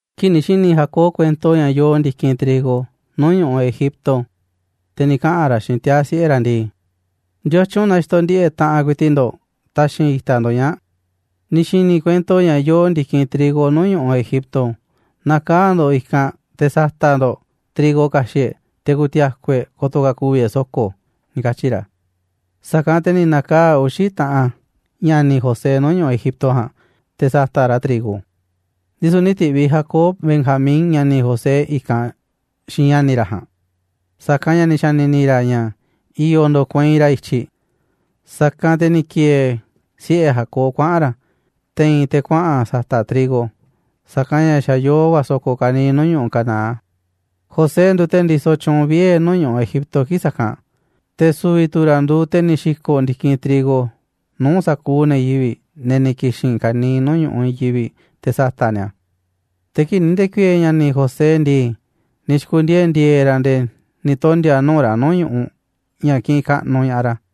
Kii̱ꞌ ni̱ xi̱ni̱ Jacob kuento ña̱ yoo ndi̱kinꞌ trigo nuu̱ꞌ ñu̱ꞌuꞌ Egipto, te̱ ni̱ kaꞌa̱n ra̱ xiinꞌ tiaa̱ siꞌe̱ ra̱ ndii: ―¿Ndiotyun na xitoꞌ ndiꞌe̱ꞌ taꞌanꞌ ku̱i̱ti̱ꞌ ndo̱ꞌ taxi̱nꞌ itaꞌ ndo̱ꞌ ñaa̱ꞌ? Ni̱ xi̱ni̱ i̱ kuento ña̱ yoo ndi̱kinꞌ trigo nuu̱ꞌ ñu̱ꞌuꞌ Egipto, na̱kaa̱ꞌ ndo̱ꞌ i̱kanꞌ te̱ sa̱ta̱ꞌ ndo̱ꞌ trigo ka̱xi̱ꞌ e̱ꞌ, te̱ ku̱ti̱a̱ku̱ e̱ꞌ ko̱to̱ ka̱ ku̱vi̱ e̱ꞌ so̱ko̱ ―ni̱ katyi̱ ra̱. Sa̱kanꞌ te̱ ni̱ na̱kaa̱ꞌ uxi̱ taꞌan ña̱ni̱ José nuu̱ꞌ ñu̱ꞌuꞌ Egipto ja̱a̱nꞌ te̱ sa̱ta̱ꞌ ra̱ trigo, ndisu̱ nï̱ ti̱ꞌviꞌ Jacob Benjamín, ña̱ni̱ José, i̱kanꞌ xiinꞌ ña̱ni̱ ra̱ ja̱a̱nꞌ, sa̱kanꞌ ña̱ ni̱ xa̱ni̱ni̱ ra̱ ña̱ i̱yo̱ ndo̱kueinꞌ ra̱ i̱tyiꞌ. Sa̱kanꞌ te̱ ni̱ ki̱e̱e̱ siꞌe̱ Jacob kuaꞌa̱n ra̱ te̱i̱n te̱ kuaꞌa̱n sa̱ta̱ꞌ trigo, sa̱kanꞌ ña̱ xa̱ yoo va̱ so̱ko̱ ka̱niiꞌ nuu̱ꞌ ñu̱ꞌuꞌ Canaán. José nduuꞌ te̱ ndisoꞌ tyuunꞌ vie̱ nuu̱ꞌ ñu̱ꞌuꞌ Egipto kii̱ꞌ sa̱kanꞌ, te̱ su̱vi̱ tu̱ ra̱ nduuꞌ te̱ ni̱ xi̱ko̱ꞌ ndi̱kinꞌ trigo nuu̱ꞌ sa̱kuuꞌ ne̱ yivi̱ꞌ, ne̱ ni̱ ki̱xi̱n ka̱niiꞌ nuu̱ꞌ ñu̱ꞌuꞌ i̱i̱n yivi̱ꞌ te̱ sa̱ta̱ꞌ ni̱a̱ a̱. Te̱ kii̱ꞌ ni̱ nde̱ku̱i̱e̱e̱ ña̱ni̱ José ndii, ni̱ xi̱ku̱ndiee̱ ndi̱e̱e̱ ra̱ nde̱e̱ ni̱ tondi̱a̱ nuu̱ꞌ ra̱ nuu̱ꞌ ñu̱ꞌuꞌ ña̱ kiꞌinꞌ kaꞌnuꞌ ña̱ꞌaꞌ ra̱.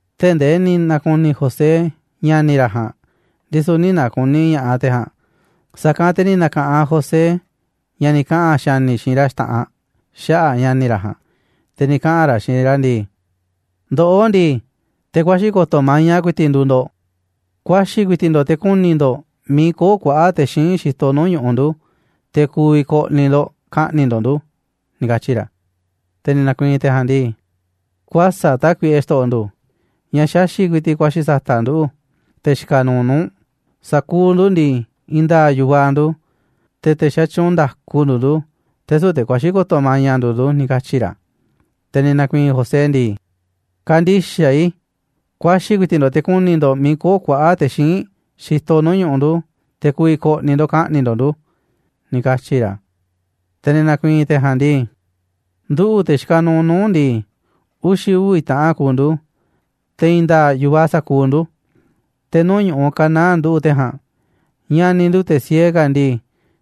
Tee̱ꞌ ndee ni̱ na̱ku̱ni̱ José ña̱ni̱ ra̱ ja̱a̱nꞌ, ndisu̱ nï̱ na̱ku̱ni̱ ña̱ꞌaꞌ te̱ ja̱a̱nꞌ. Sa̱kanꞌ te̱ ni̱ na̱ka̱ꞌanꞌ José ña̱ ni̱ kaꞌa̱n xa̱ni̱ xiinꞌ ra̱ xta̱ꞌanꞌ xaꞌa̱ꞌ ña̱ni̱ ra̱ ja̱a̱nꞌ, te̱ ni̱ kaꞌa̱n ra̱ xiinꞌ ra̱ ndii: ―Ndoꞌó ndii, te̱ kuaxi̱ ko̱to̱ maña ku̱i̱ti̱ꞌ nduuꞌ ndo̱ꞌ. Kuaxi̱ ku̱i̱ti̱ꞌ ndo̱ꞌ te̱ ku̱ni̱ ndo̱ꞌ miiꞌ köo̱ꞌ kuaꞌa̱ꞌ te̱ xíinꞌ xitoꞌ nuu̱ꞌ ñu̱ꞌuꞌ ndu̱, te̱ ku̱vi̱ ko̱ꞌni̱ ndo̱ꞌ ka̱ꞌni̱ꞌ ndo̱ꞌ ndu̱ ―ni̱ katyi̱ ra̱. Te̱ ni̱ na̱ku̱i̱i̱n te̱ ja̱a̱nꞌ ndii: ―Kuäsa̱ꞌ tákuiꞌe, xto̱ꞌo̱ ndu̱, ña̱ xaxi̱ꞌ ku̱i̱ti̱ꞌ kuaxi̱ sa̱ta̱ꞌ nduꞌu̱, te̱ xikaꞌ nuuꞌ nuu̱ꞌ u̱nꞌ. Sa̱kuuꞌ ndu̱ ndii, i̱i̱n nda̱a̱ꞌ yu̱vaꞌ ndu̱, te̱ te̱ xatyuunꞌ nda̱ku nduuꞌ ndu̱, te̱ süu̱ꞌ te̱ kuaxi̱ ko̱to̱ maña nduuꞌ ndu̱ ―ni̱ katyi̱ ra̱. Te̱ ni̱ na̱ku̱i̱i̱n José ndii: ―Kä̱ndi̱xaꞌ i̱, kuaxi̱ ku̱i̱ti̱ꞌ ndo̱ꞌ te̱ ku̱ni̱ ndo̱ꞌ miiꞌ köo̱ꞌ kuaꞌa̱ꞌ te̱ xíinꞌ xitoꞌ nuu̱ꞌ ñu̱ꞌuꞌ ndu̱, te̱ ku̱vi̱ ko̱ꞌni̱ ndo̱ꞌ ka̱ꞌni̱ꞌ ndo̱ꞌ ndu̱ ―ni̱ katyi̱ ra̱. Te̱ ni̱ na̱ku̱i̱i̱n te̱ ja̱a̱nꞌ ndii: ―Nduꞌu̱, te̱ xikaꞌ nuuꞌ nuu̱ꞌ u̱nꞌ ndii, uxi̱ uvi̱ taꞌan kuuꞌ ndu̱, te̱ i̱i̱n nda̱a̱ꞌ yu̱vaꞌ sa̱kuuꞌ ndu̱, te̱ nuu̱ꞌ ñu̱ꞌuꞌ Canaán nduꞌu̱ꞌ te̱ ja̱a̱nꞌ. Ña̱ni̱ ndu̱, te̱ siee ka̱ ndii,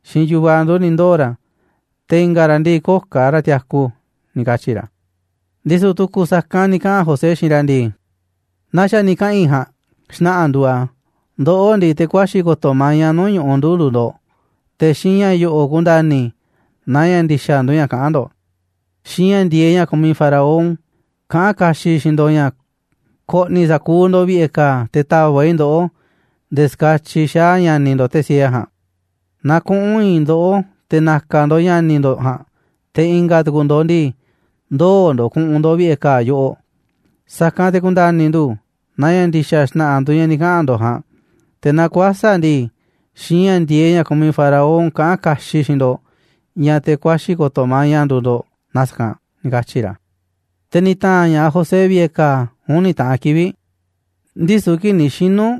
xiinꞌ yu̱vaꞌ ndu̱ ni̱ ndoo̱ ra̱, te̱ i̱nga̱ ra̱ ndii, köo̱ꞌ ka̱ ra̱ tiaku ―ni̱ katyi̱ ra̱. Ndisu̱ tu̱ku̱ sa̱kanꞌ ni̱ kaꞌa̱n José xiinꞌ ra̱ ndii: ―Naa xa̱ ni̱ kaꞌa̱n i̱ ja̱a̱nꞌ, xna̱ꞌa̱ nduuꞌ a̱, ndoꞌó ndii, te̱ kuaxi̱ ko̱to̱ maña nuu̱ꞌ ñu̱ꞌuꞌ ndu̱ nduuꞌ ndo̱ꞌ. Te̱ xiinꞌ ña̱ yo̱ꞌo̱ ku̱nda̱ni̱ i̱ naaꞌ ña̱ ndi̱xa̱ nduuꞌ ña̱ kaꞌán ndo̱ꞌ: Xiinꞌ ña̱ ndi̱e̱eꞌ ña̱ kumiꞌ Faraón kaꞌán kaxiꞌ i̱ xiinꞌ ndo̱ꞌ ña̱ ko̱ꞌni̱ i̱ sa̱kuuꞌ ndo̱ꞌ vi̱ꞌe̱ ka̱a̱, te̱ ta̱va̱ꞌ i̱ ndoꞌó nde̱e̱ ska̱tyiꞌ xaa̱ ña̱ni̱ ndo̱ꞌ, te̱ siee ja̱a̱nꞌ. Na kuꞌu̱n i̱i̱n ndoꞌó te̱ na̱ka̱ ndo̱ꞌ ña̱ni̱ ndo̱ꞌ ja̱a̱nꞌ, te̱ i̱nga̱ tu̱ku̱ ndo̱ꞌ ndii, ndoo̱ ndo̱ꞌ ku̱ꞌu̱n ndo̱ꞌ vi̱ꞌe̱ ka̱a̱ yoꞌoꞌ. Sa̱kanꞌ te̱ ku̱nda̱ni̱ ndu̱ naaꞌ ña̱ ndi̱xa̱ xna̱ꞌa̱ nduuꞌ ña̱ ni̱ kaꞌa̱n ndo̱ꞌ ja̱a̱nꞌ, te̱ naaꞌ kuäsa̱ꞌ ndii, xiinꞌ ña̱ ndi̱e̱eꞌ ña̱ kumiꞌ Faraón kaꞌán kaxiꞌ i̱ xiinꞌ ndo̱ꞌ ña̱ te̱ kuaxi̱ ko̱to̱ maña nduuꞌ ndo̱ꞌ na sa̱kanꞌ ―ni̱ katyi̱ ra̱ Te̱ ni̱ ta̱a̱nꞌ ña̱ꞌaꞌ José vi̱ꞌe̱ ka̱a̱ uni̱ taꞌan kivi̱ꞌ. Ndisu̱ kii̱ꞌ ni̱ xinu̱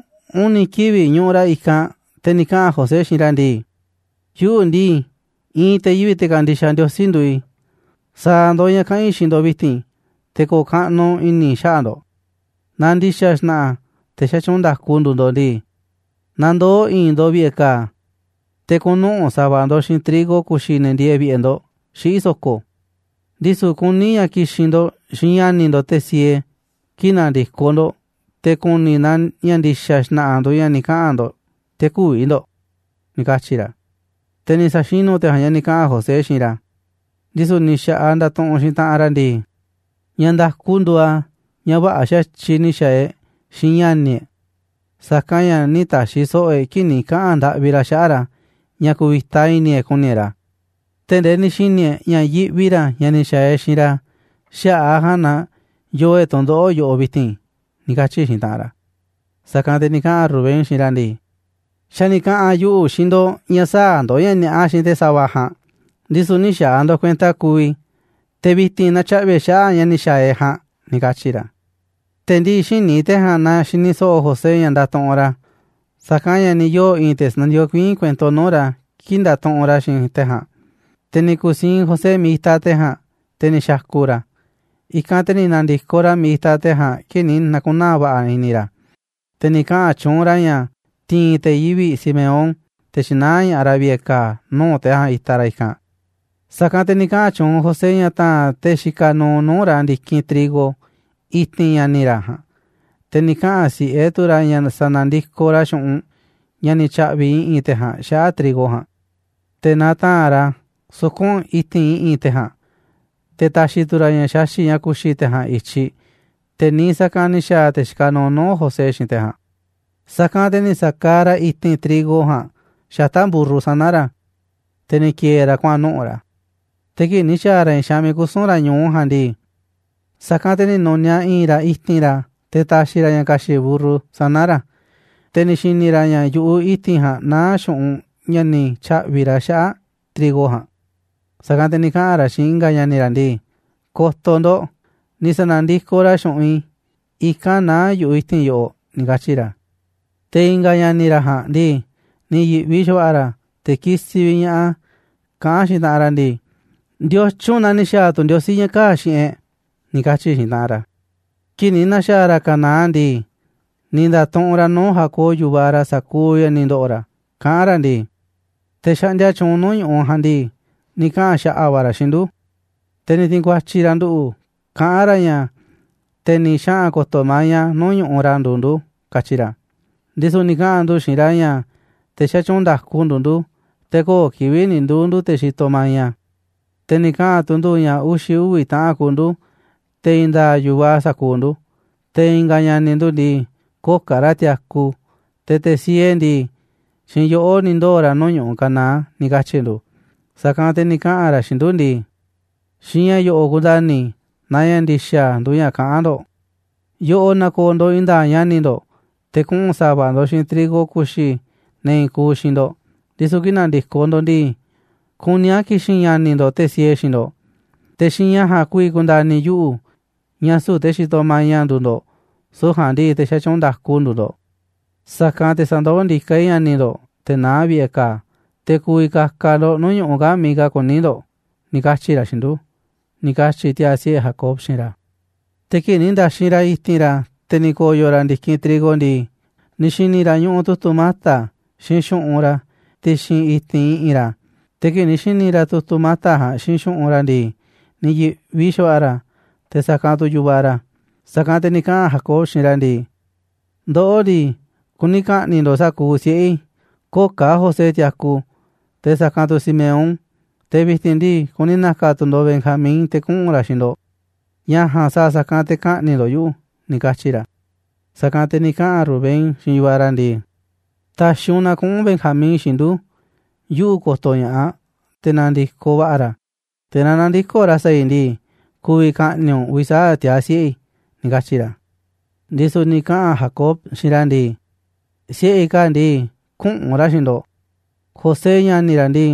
uni̱ kivi̱ꞌ ñuꞌuꞌ ra̱ i̱kanꞌ, te̱ ni̱ kaꞌa̱n José xiinꞌ ra̱ ndii: ―Yuꞌu̱ ndii, i̱i̱n te̱ yivi̱ꞌ te̱ kandixaꞌ Ndiosí nduuꞌ i̱. Sa̱a̱ ndo̱ꞌ ña̱ kaꞌa̱n i̱ xiinꞌ ndo̱ꞌ vi̱ti̱n te̱ ko̱o̱ kaꞌnuꞌ i̱ni̱ i̱ xaꞌa̱ꞌ ndo̱ꞌ. Naaꞌ ndi̱xa̱ xna̱ꞌa̱ te̱ xatyuunꞌ nda̱ku nduuꞌ ndo̱ꞌ ndii, na ndoo̱ i̱i̱n ndo̱ꞌ vi̱ꞌe̱ ka̱a̱, te̱ kuꞌu̱n nuꞌu̱ꞌ sa̱va̱ ndo̱ꞌ xiinꞌ trigo ku̱xi̱ ne̱ ndieeꞌ vi̱ꞌe̱ ndo̱ꞌ xiꞌí so̱ko̱. Ndisu̱ kuní a̱ ña̱ ki̱xi̱n ndo̱ꞌ xiinꞌ ña̱ni̱ ndo̱ꞌ, te̱ siee, kii̱ꞌ na̱ndi̱koꞌ ndo̱ꞌ te̱ ku̱ni̱ i̱ naaꞌ ña̱ ndi̱xa̱ xna̱ꞌa̱ nduuꞌ ña̱ ni̱ kaꞌa̱n ndo̱ꞌ te̱ kü̱vi̱ ndo̱ꞌ ―ni̱ katyi̱ ra̱. Te̱ ni̱ sa̱xinu̱ te̱ ja̱a̱nꞌ ña̱ ni̱ kaꞌa̱n José xiinꞌ ra̱. Ndisu̱ ni̱ xa̱ꞌaꞌ ndatuꞌunꞌ xiinꞌ taꞌanꞌ ra̱ ndii: ―Ña̱ nda̱ku nduuꞌ a̱ ña̱ vä̱ꞌa̱ xa̱tyiꞌ ni̱ xa̱a̱ e̱ꞌ xiinꞌ ña̱ni̱ e̱ꞌ, sa̱kanꞌ ña̱ nï̱ ta̱xi̱ so̱ꞌo̱ e̱ꞌ kii̱ꞌ ni̱ kaꞌa̱n ndaꞌvi ra̱ xaꞌa̱ꞌ ra̱ ña̱ ku̱vi̱ta i̱ni̱ e̱ꞌ ku̱ni̱ e̱ꞌ ra̱, tee̱ꞌ ndee ni̱ xi̱ni̱ e̱ꞌ ña̱ yiꞌvi ra̱ ña̱ ni̱ xa̱a̱ e̱ꞌ xiinꞌ ra̱, xaꞌa̱ꞌ a̱ ja̱a̱nꞌ na yoo e̱ꞌ tu̱ndoꞌo̱ꞌ yoꞌoꞌ vi̱ti̱n ―ni̱ katyi̱ xiinꞌ taꞌanꞌ ra̱. Sa̱kanꞌ te̱ ni̱ kaꞌa̱n Rubén xiinꞌ ra̱ ndii: ―Xa̱ ni̱ kaꞌa̱n yuꞌu̱ xiinꞌ ndo̱ꞌ ña̱ sä̱a̱ ndo̱ꞌ ña̱ ni̱a̱ꞌa xiinꞌ te̱ sa̱va̱ ja̱a̱nꞌ, ndisu̱ nï̱ xa̱a̱ ndo̱ꞌ kuenta kuuꞌ i̱, te̱ vi̱ti̱n natyaꞌvi̱ e̱ꞌ xaꞌa̱ꞌ ña̱ ni̱ xa̱a̱ e̱ꞌ ja̱a̱nꞌ ―ni̱ katyi̱ ra̱. Te̱ ndii xïní te̱ ja̱a̱nꞌ naaꞌ xini so̱ꞌo̱ José ña̱ ndatuꞌunꞌ ra̱, sa̱kanꞌ ña̱ ni̱ yoo̱ i̱i̱n te̱ sandikokuiín kuento nuu̱ꞌ ra̱ kii̱ꞌ ndatuꞌunꞌ ra̱ xiinꞌ te̱ ja̱a̱nꞌ. Te̱ ni̱ ku̱siinꞌ José miiꞌ itaꞌ te̱ ja̱a̱nꞌ, te̱ ni̱ xa̱ku̱ ra̱. I̱kanꞌ te̱ ni̱ na̱ndi̱koꞌ ra̱ miiꞌ itaꞌ te̱ ja̱a̱nꞌ kii̱ꞌ ni̱ na̱ku̱naa̱ va̱ꞌa̱ i̱ni̱ ra̱, te̱ ni̱ kaꞌa̱n tyuunꞌ ra̱ ña̱ ti̱i̱n te̱ yivi̱ꞌ Simeón te̱ tyi̱naá ña̱ꞌaꞌ ra̱ vi̱ꞌe̱ ka̱a̱ nuu̱ꞌ te̱ ja̱a̱nꞌ itaꞌ ra̱ i̱kanꞌ. Sa̱kanꞌ te̱ ni̱ kaꞌa̱n tyuunꞌ José ña̱ ta̱a̱nꞌ te̱ xikaꞌ nuuꞌ nuu̱ꞌ ra̱ ndi̱kinꞌ trigo i̱ti̱n ña̱ni̱ ra̱ ja̱a̱nꞌ, te̱ ni̱ kaꞌa̱n si̱ꞌe tu̱ ra̱ ña̱ sa̱na̱ndikoꞌ ra̱ xu̱ꞌunꞌ ña̱ ni̱ tya̱ꞌvi̱ i̱ꞌi̱n te̱ ja̱a̱nꞌ xaꞌa̱ꞌ trigo ja̱a̱nꞌ, te̱ na ta̱a̱nꞌ ra̱ a̱ suku̱nꞌ i̱ti̱n i̱ꞌi̱n te̱ ja̱a̱nꞌ, te̱ ta̱xi̱ tu̱ ra̱ ña̱ xaxi̱ꞌ ña̱ ku̱xi̱ te̱ ja̱a̱nꞌ i̱tyiꞌ, te̱ niiꞌ sa̱kanꞌ ni̱ xa̱a̱ te̱ xikaꞌ nuuꞌ nuu̱ꞌ José xiinꞌ te̱ ja̱a̱nꞌ. Sa̱kanꞌ te̱ ni̱ sa̱kaaꞌ ra̱ i̱ti̱n trigo ja̱a̱nꞌ xata̱ꞌ mburru sana̱ ra̱, te̱ ni̱ ki̱e̱e̱ ra̱ kuaꞌa̱n nuꞌu̱ꞌ ra̱. Te̱ kii̱ꞌ ni̱ xa̱a̱ ra̱ i̱i̱n xaanꞌ miiꞌ kusu̱n ra̱ ñu̱u ja̱a̱nꞌ ndii, sa̱kanꞌ te̱ ni̱ nu̱niaꞌ i̱i̱n ra̱ i̱ti̱n ra̱ te̱ ta̱xi̱ ra̱ ña̱ ka̱xi̱ꞌ mburru sana̱ ra̱, te̱ ni̱ xi̱ni̱ ra̱ ña̱ yu̱ꞌuꞌ i̱ti̱n ja̱a̱nꞌ naá xu̱ꞌunꞌ ña̱ ni̱ tya̱ꞌvi̱ ra̱ xaꞌa̱ꞌ trigo ja̱a̱nꞌ. Sa̱kanꞌ te̱ ni̱ kaꞌa̱n ra̱ xiinꞌ i̱nga̱ ña̱ni̱ ra̱ ndii: ―Ko̱to̱ ndo̱ꞌ, ni̱ sa̱na̱ndikoꞌ ra̱ xu̱ꞌunꞌ i̱, i̱kanꞌ naá yu̱ꞌuꞌ i̱ti̱n yoꞌoꞌ ―ni̱ katyi̱ ra̱. Te̱ i̱nga̱ ña̱ni̱ ra̱ ja̱a̱nꞌ ndii, ni̱ yi̱ꞌvi xa̱va̱ꞌa̱ ra̱, te̱ kisiꞌ vi̱ꞌ ña̱ꞌaꞌ a̱, kaꞌán xiinꞌ taꞌanꞌ ra̱ ndii: ―¿Ndiotyun na ni̱ xa̱a̱ tu̱ Ndiosí ña̱ kaa̱ꞌ xiinꞌ e̱ꞌ? ―ni̱ katyi̱ xiinꞌ taꞌanꞌ ra̱. Kii̱ꞌ ni̱ na̱xa̱a̱ ra̱ Canaán ndii, ni̱ nda̱tuꞌunꞌ ra̱ nuu̱ꞌ Jacob, yu̱vaꞌ ra̱, sa̱kuuꞌ ña̱ ni̱ ndo̱ꞌo̱ ra̱, kaꞌán ra̱ ndii: ―Te̱ xaꞌndia tyuunꞌ nuu̱ꞌ ñu̱ꞌuꞌ ja̱a̱nꞌ ndii, ni̱ kaꞌa̱n xa̱ꞌa̱ va̱ ra̱ xiinꞌ ndu̱, te̱ ni̱ ti̱i̱n ku̱a̱tyi̱ ra̱ nduꞌu̱ kaꞌán ra̱ ña̱ te̱ ni̱ xaꞌa̱n ko̱to̱ maña nuu̱ꞌ ñu̱ꞌuꞌ ra̱ nduuꞌ ndu̱, katyi ra̱. Ndisu̱ ni̱ kaꞌa̱n ndu̱ xiinꞌ ra̱ ña̱ te̱ xatyuunꞌ nda̱ku nduuꞌ ndu̱, te̱ köo̱ꞌ kivi̱ꞌ ni̱ nduu̱ ndu̱ te̱ xitoꞌ maña. Te̱ ni̱ kaꞌa̱n tu̱ ndu̱ ña̱ uxi̱ uvi̱ taꞌan kuuꞌ ndu̱, te̱ i̱i̱n nda̱a̱ꞌ yu̱vaꞌ sa̱kuuꞌ ndu̱, te̱ i̱nga̱ ña̱ni̱ ndu̱ ndii, köo̱ꞌ ka̱ ra̱ tiaku, te̱ te̱ siee ndii, xiinꞌ yoꞌó ni̱ ndoo̱ ra̱ nuu̱ꞌ ñu̱ꞌuꞌ Canaán, ni̱ katyi̱ ndu̱. Sa̱kanꞌ te̱ ni̱ kaꞌa̱n ra̱ xiinꞌ ndu̱ ndii: “Xiinꞌ ña̱ yo̱ꞌo̱ ku̱nda̱ni̱ i̱ naaꞌ ña̱ ndi̱xa̱ nduuꞌ ña̱ kaꞌán ndo̱ꞌ. Yoꞌoꞌ na̱ko̱o̱ ndo̱ꞌ i̱i̱n nda̱a̱ꞌ ña̱ni̱ ndo̱ꞌ, te̱ kuꞌu̱n sa̱va̱ ndo̱ꞌ xiinꞌ trigo ku̱xi̱ ne̱ i̱i̱n kuuꞌ xiinꞌ ndo̱ꞌ, ndisu̱ kii̱ꞌ na̱ndi̱koꞌ ndo̱ꞌ ndii, kuní a̱ ki̱xi̱n ña̱ni̱ ndo̱ꞌ, te̱ siee, xiinꞌ ndo̱ꞌ. Te̱ xiinꞌ ña̱ ja̱a̱nꞌ ku̱vi̱ ku̱nda̱ni̱ yuꞌu̱ ña̱ süu̱ꞌ te̱ xitoꞌ maña nduuꞌ ndo̱ꞌ, süu̱ꞌ ja̱a̱nꞌ ndii, te̱ xatyuunꞌ nda̱ku nduuꞌ ndo̱ꞌ, sa̱kanꞌ te̱ sa̱ndoó ndiká i̱ ña̱ni̱ ndo̱ꞌ, te̱ naá vi̱ꞌe̱ ka̱a̱, te̱ ku̱vi̱ ka̱ka̱ ndo̱ꞌ nuu̱ꞌ ñu̱ꞌuꞌ kaa̱ꞌ miiꞌ ka̱ kuní ndo̱ꞌ”, ni̱ katyi̱ ra̱ xiinꞌ ndu̱ ―ni̱ katyi̱ tiaa̱ siꞌe̱ Jacob xiinꞌ ra̱. Te̱ kii̱ꞌ ni̱ nda̱xinꞌ ra̱ i̱ti̱n ra̱, te̱ ni̱ ko̱yo̱ ra̱ ndi̱kinꞌ trigo ndii, ni̱ xi̱ni̱ ra̱ ñuꞌuꞌ tu̱tu̱ mata̱ xiinꞌ xu̱ꞌunꞌ ra̱ ti̱xi̱n i̱ti̱n i̱ꞌi̱n ra̱. Te̱ kii̱ꞌ ni̱ xi̱ni̱ ra̱ tu̱tu̱ mata̱ ja̱a̱nꞌ xiinꞌ xu̱ꞌunꞌ ra̱ ndii, ni̱ yi̱ꞌvi xa̱va̱ꞌa̱ ra̱, te̱ sa̱kanꞌ tu̱ yu̱vaꞌ ra̱. Sa̱kanꞌ te̱ ni̱ kaꞌa̱n Jacob xiinꞌ ra̱ ndii: ―Ndoꞌó ndii, kuni ka̱ꞌni̱ꞌ ndo̱ꞌ sa̱kuuꞌ siꞌe̱ i̱, köo̱ꞌ ka̱ José tiaku, te̱ sa̱kanꞌ tu̱ Simeón, te̱ vi̱ti̱n ndii, kuni na̱ka̱ tu̱ ndo̱ꞌ Benjamín te̱ kuꞌu̱n ra̱ xiinꞌ ndo̱ꞌ. Ña̱ ja̱a̱nꞌ sa̱a̱ sa̱kanꞌ te̱ ka̱ꞌni̱ꞌ ndo̱ꞌ yuꞌu̱ ―ni̱ katyi̱ ra̱. Sa̱kanꞌ te̱ ni̱ kaꞌa̱n Rubén xiinꞌ yu̱vaꞌ ra̱ ndii: ―Ta̱xi̱ u̱nꞌ na kuꞌu̱n Benjamín xiinꞌ ndu̱, yuꞌu̱ ko̱to̱ ña̱ꞌaꞌ te̱ na̱ndi̱koꞌ va̱ꞌa̱ ra̱, te̱ naaꞌ nä̱ndi̱koꞌ ra̱ sa̱a̱ i̱ ndii, ku̱vi̱ ka̱ꞌni̱ꞌ u̱nꞌ uvi̱ sa̱aꞌ tiaa̱ siꞌe̱ i̱ ―ni̱ katyi̱ ra̱. Ndisu̱ ni̱ kaꞌa̱n Jacob xiinꞌ ra̱ ndii: ―Siꞌe̱ i̱ kaa̱ꞌ ndii, küꞌu̱n ra̱ xiinꞌ ndo̱ꞌ. José, ña̱ni̱ ra̱ ndii,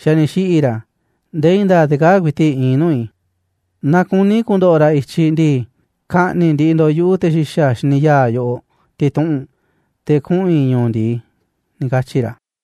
xa̱ ni̱ xiꞌi̱ ra̱. Nde̱e̱ i̱i̱n nda̱a̱ꞌ te̱ kaa̱ꞌ ku̱i̱ti̱ꞌ iinꞌ nuu̱ꞌ i̱. Naaꞌ kuni̱ ku̱ndo̱ꞌo̱ ra̱ i̱tyiꞌ ndii, ka̱ꞌni̱ꞌ ndiꞌiꞌ ndo̱ꞌ yuꞌu̱ te̱ xi̱xa̱ xíniꞌ ya̱a̱ yoꞌoꞌ ti̱tuꞌu̱nꞌ, te̱ kuꞌu̱n i̱ ñu̱u̱ ndi̱i ―ni̱ katyi̱ ra̱.